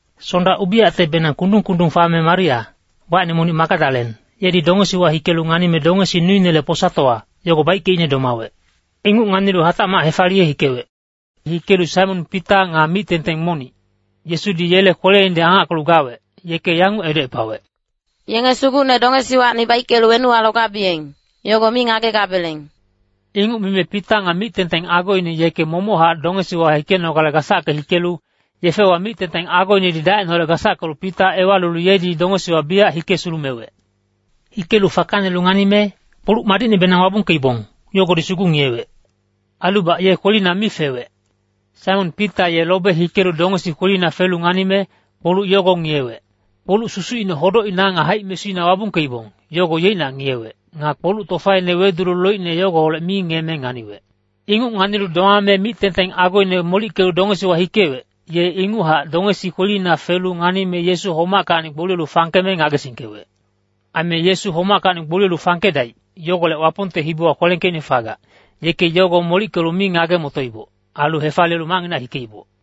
Sonda ubiyactebenang kundung-kundung fame Maria, wacine monic Magadalen, yedi dongesiwa hikelu nganime dongesi nuinele posatowa, yogo baickeicne domawec. Inguc nganilu hatacmac hefaliye hikewec. Hikelu Saimon Pita nga mic-tengteng monic, Yesudi yele kweleinedi angackelu gawec, yeke yanguc edocepawec, “Yenge Sugucne dongesiwacni baickelu wenuwa logabiyeng, yogo mi ngagegabeleng.” Inguc mime Pita nga mic-tengteng agoine yeke momochac dongesiwa hikenogale gasacke hikelu, yefewa mic-tengteng agoinedi dacineholec gasackelu Pita ewalilu yedi dongesiwa biyac hike sulumewec. Hikelu fakanelu nganime, kpoluc madicnebenang wabungkeibong, yogodi sugu ngiyewec. Ailubac ye kwelina mi fewec. Saimon Pita ye lobe hikelu dongesi kwelina felu nganime, kpoluc yogo ngiyewec. Kpoluc susucine hodocina nga haic-mesuina wabungkeibong, yogo yeicnac ngiyewec. Nga kpoluc tofaine wedulu loicne yogoholec mi ngiyeme nganiwec. Inguc nganilu domame mic-tengteng agoine molickelu dongesiwa hikewec, ye inguchac dongesi kwelina felu nganime Yesu homackacni gboliyelu fangkeme ngagesingkewec. Aime Yesu homackacni gboliyelu fangkedaic, yogolec Wapongte hibiwa kwelengkeicne fagac, yeke yogo molickelu mi ngage-motoiboc, ailu hefaliyelu macnginac hikeiboc.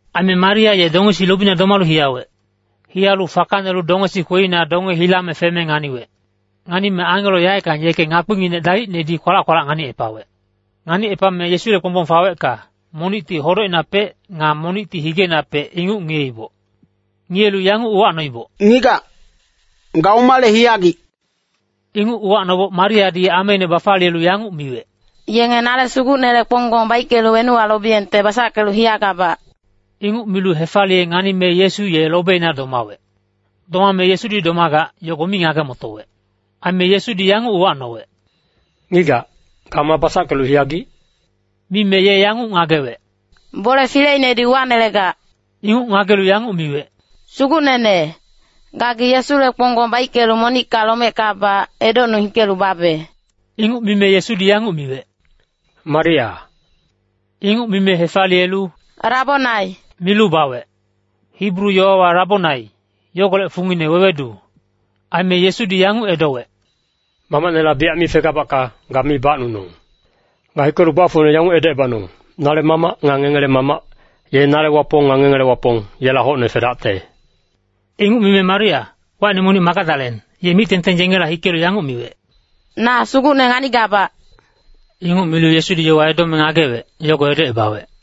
Aime Maria ye dongesi lobina domalu hiyawec. Hiyalu fakanelu dongesi kwelina donge hilame feme nganiwec. Nganime angelo yaeckang yeke ngakpinginec dalicnedi kwalac-kwalac nganicepawec. Nganicepame Yesule kponggbong fawecka, monicti hodocinapec, nga monicti higeinapec, inguc ngiyeiboc. Ngiyelu yanguc uwacnoiboc, “Ngigac, ga omale hiyagic?” Inguc uwacnoboc Mariadi ameine bafaliyelu yanguc miwec, “Yenge nale Sugucnele kponggbong baickelu wenuwa lobiyengte basackelu hiyagabac.” Inguc milu hefaliye nganime Yesu ye lobeina domawec. Domame Yesudi domagac, yogo mi ngage-motowec. Aime Yesudi yanguc uwacnowec, “Ngigac, ga ma basackelu hiyagic?” Mime ye yanguc ngagewec, “Bole fileinedi uwanelegac.” Inguc ngagelu yanguc miwec, “Sugucnene, gagi Yesule kponggbong baickelu monicka lomeckabac, edocnung hikelu babe.” Inguc mime Yesudi yanguc miwec, “Maria.” Inguc mime hefaliyelu “Rabonai” milu bawec. (Hibru yowawa Rabonai, yogolec fungine wewedu.) Aime Yesudi yanguc edowec, “Mamacnela biyac mi fegabacka, ga mi bacnunong. Ga hikelu gbafocne yanguc edocebanong, ‘Nale Mamac nga ngengele Mamac, ye nale Wapong nga ngengele Wapong, yela hocne fedacte.’” Inguc mime Maria, wacine monic Magadalen, ye mic-tengteng yengela hikelu yanguc miwec, “Na Sugucne nganigabac!” Inguc milu Yesudi yowa edome ngagewec, yogo edocebawec.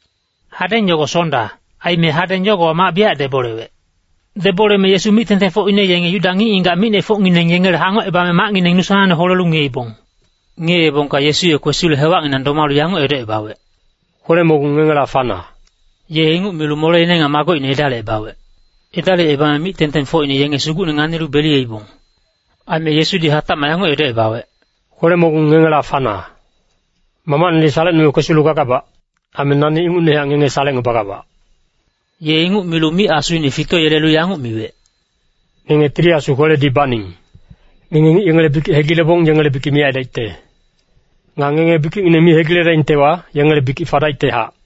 Hadeng yogo Sonda, aime hadeng yogowa mac biyac debolewec. Deboleme Yesu mic-tengtengfocine yenge Yuda ngic-ngigac micnefocngineng yengele hangocebame macngineng nu sanangne holelu ngiyeibong. Ngiyeebongka Yesu ye kwesilu hewacnginang domalu yanguc edocebawec, “Kwele-mogung ngengela fana.” Ye inguc milu moleine nga magocine edalicebawec. Edalicebame mic-tengtengfocine yenge Sugucne nganilu beliyeibong. Aime Yesudi hatacmac yanguc edocebawec, “Kwele-mogung ngengela fana. Mamacnedi salecnume kwesilu gagabac. Aime nani ingucnehac ngenge salecngebagabac.” Ye inguc milu mic asuine fitoyelelu yanguc miwec, “Ngenge Tili Asu kweledi baning. Ngenge ngic yengele bikic hegilebong yengele bikic miyac aidaicte. Nga ngenge bikicngineng mi hegiledaingtewa, yengele bikic fadaictehac.”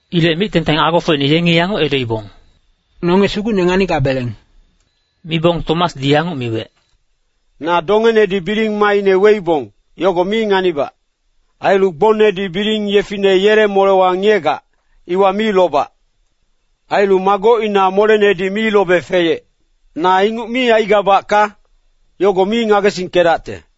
Ilec mic-tengteng agofocine yengi yanguc edoibong, “Nonge Sugucne nganigabeleng.” Mibong Tomasdi yanguc miwec, “Na dongenedi biling maaine weibong, yogo mi nganibac. Ailu gbongnedi biling yefine yele molewa ngiyegac, iwa mi lobac. Ailu magocina molenedi mi lobe feyec. Na inguc mi aigabacka, yogo mi ngagesingkedacte.”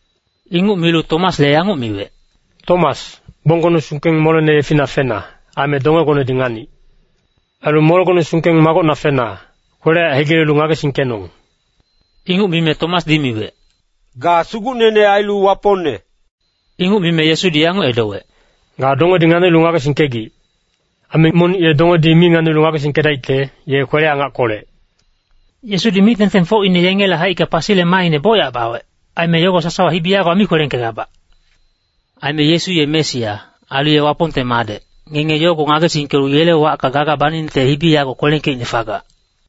Inguc milu Tomasle yanguc miwec, “Tomas, gbonggone sungkeng molene yefina fena, aime dongegonedi nganic. Ailu molegone sungkeng magocna fena, kwele-yaec hegilelu ngagesingkenong.” Inguc mime Tomasdi miwec, “Ga Sugucnene ailu Wapongne.” Inguc mime Yesudi yanguc edowec, “Ga dongedi nganicnulu ngagesingkegic. Aime monic ye dongedi mi nganilu ngagesingkedaicte, ye kwele-angackolec.” Yesudi mic-tengtengfocine yengele haicka pasile maaine bocyac bawec, aime yogo sasawa hibi yagowa mi kwelengkegabac. Aime Yesu ye Mesia, ailu ye Wapongte Madec, ngenge yogo ngagesingkelu yele wacka gaga baningte hibi yago kwelengkeicne fagac.